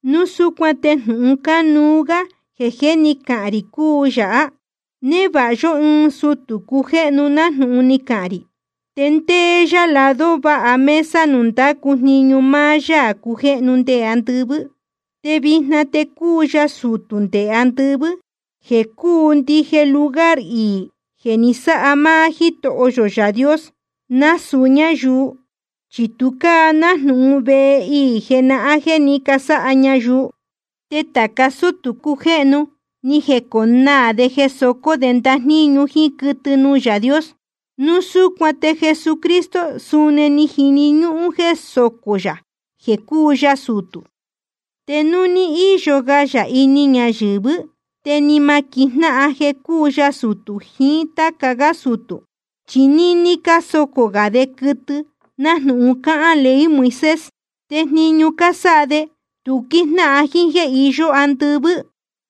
Núu súcuan te jnūhun cánuú gá jeē jé ni cahān rī cúu yāhá: Névāha yó ɨɨn sutū cujéhnu nájnūhun ni cahān rī, te ndéé yá lado váha mesa nuū ndácu jniñu máá Yaā cujéhnu nde andɨvɨ́. Te vijna te cúu ya sutū nde andɨvɨ́, jeē cúu ndije lugar iī jeē ni sáha máá Jítoho yō Yaā Dios, nasūu ñáyuu. Chi tu cáa nájnūhun vehe iī jenahán jeē ní casáha ñayuu. Te tāca sútū cujéhnu ni jeconaā de jeē socó de ndajníñu jíín quɨtɨ nuū Yaā Dios. Núu súcuan te Jesucristo suni ni jini ñúhún jeē socó yā jeē cúu ya sutū. Te núu ní íyo ga yā ini ñayɨ̄vɨ́, te ni ma quijnáhan jeē cúu ya sutū jiín táca gá sutū, chi níní cásocō gā de quɨtɨ nájnūhun cáhán ley Moisés. Te jniñu cásáha de, tu quíjnáhan jíín jéē iyó andɨvɨ́.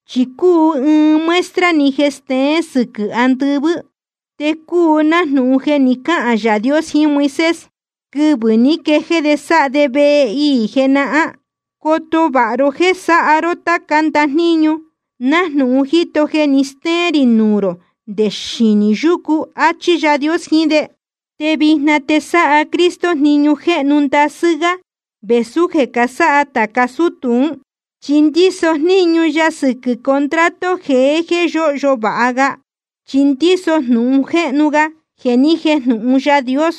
Chi cúu ɨɨn muestra‑ni jeē steén sɨquɨ̄ andɨvɨ́. Te cúu nájnūhun jeē ni cáhān Yaā Dios jiín Moisés quɨvɨ̄ ní quejéé de sáha de vehe iī jenahán: Coto vāha ró jéē sáha ró táca ndajníñu nájnūhun jíto jeē ni stéén rī nuū rō nde xinī yúcu, áchí Yaā Dios jiín de. Te vijna te sáha Cristo jniñu jéhnu ndasɨ́ gá vēsú jeē casáha tāca sútū ún, chi ndíso jníñu ya sɨquɨ̄ contrato jeé jéē yóhyo vāha ga, chi ndíso jnūhun jéhnu ga jeē ni jéjnūhun Yaā Dios.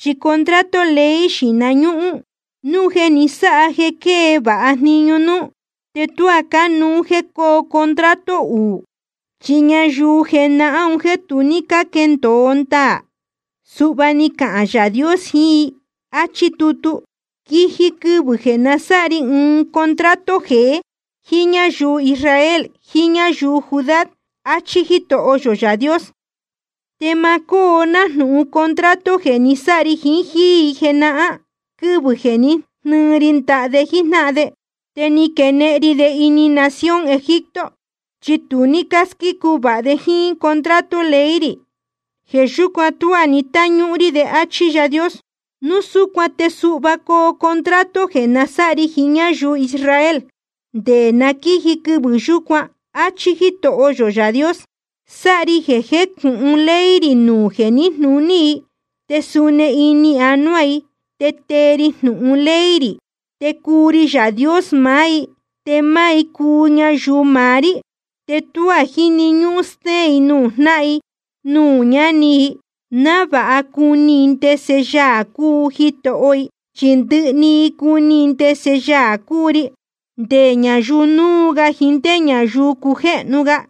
Chi contrato ley xīhna ñúhún, núu jeē ni sáha jeē quée vāha jniñu núú, te tuá cánuú jéē cóo contrato uū. Chi ñayuu jenahán un jéē tu ní cáquendōo ndaā, suhva ni cahān Yaā Dios jiín i, áchí tutu: Quiji quɨvɨ̄ jeē nasáha ri ɨɨn contrato jeé jíín ñáyuu Israel jiín ñáyuu Judá, áchí Jítoho yō Yaā Dios. Te ma cóo nájnūhun contrato jeē ni sáha ri jiín jíí i jenahán, quɨvɨ̄ jeē ní jnɨɨ ri ndaha de jíjnáhan de, te ni quenehen ri de ini nación Egipto. Chi tu ní cásquícu vāha de jíín contrato ley rī. Jeē yúcuan tuá ni táñúhún rí de, áchí Yaā Dios. Núu súcuan te suhva coo contrato jeē nasáha ri jiín ñáyuu Israel, nde na quíji quɨvɨ̄ yúcuan, áchí Jítoho yō Yaā Dios: Sáha ri jeē jécūhun ley rī nuū jeē níjnūní i, te suni ini anuá i tee ri jnūhun ley rī. Te cuu ri Yaā Dios maá i, te máá i cuu ñayuu maá rí. Te tuá jíni ñúhún stéén i nuū jnáhan i nuū ñáni i, návāha cuni i ndese Yaā cúu Jitoho i. Chi ndɨhɨ i cuni ndese Yaā cúu ri, nde ñayuu núu ga jiín ndé ñayuu cujéhnu ga.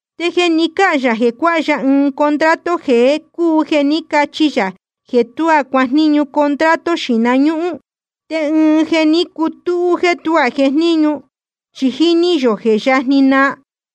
Te jeē ni cáhān yā jeē cuáha ya ɨɨn contrato jeé cúu jeē ní cachi yā jeē tuá cuajníñu contrato xīhna ñúhún. Te ɨɨn jeē ní cutúhú jéē tuá jejníñu, chi jíní yō jeē je yajni naa.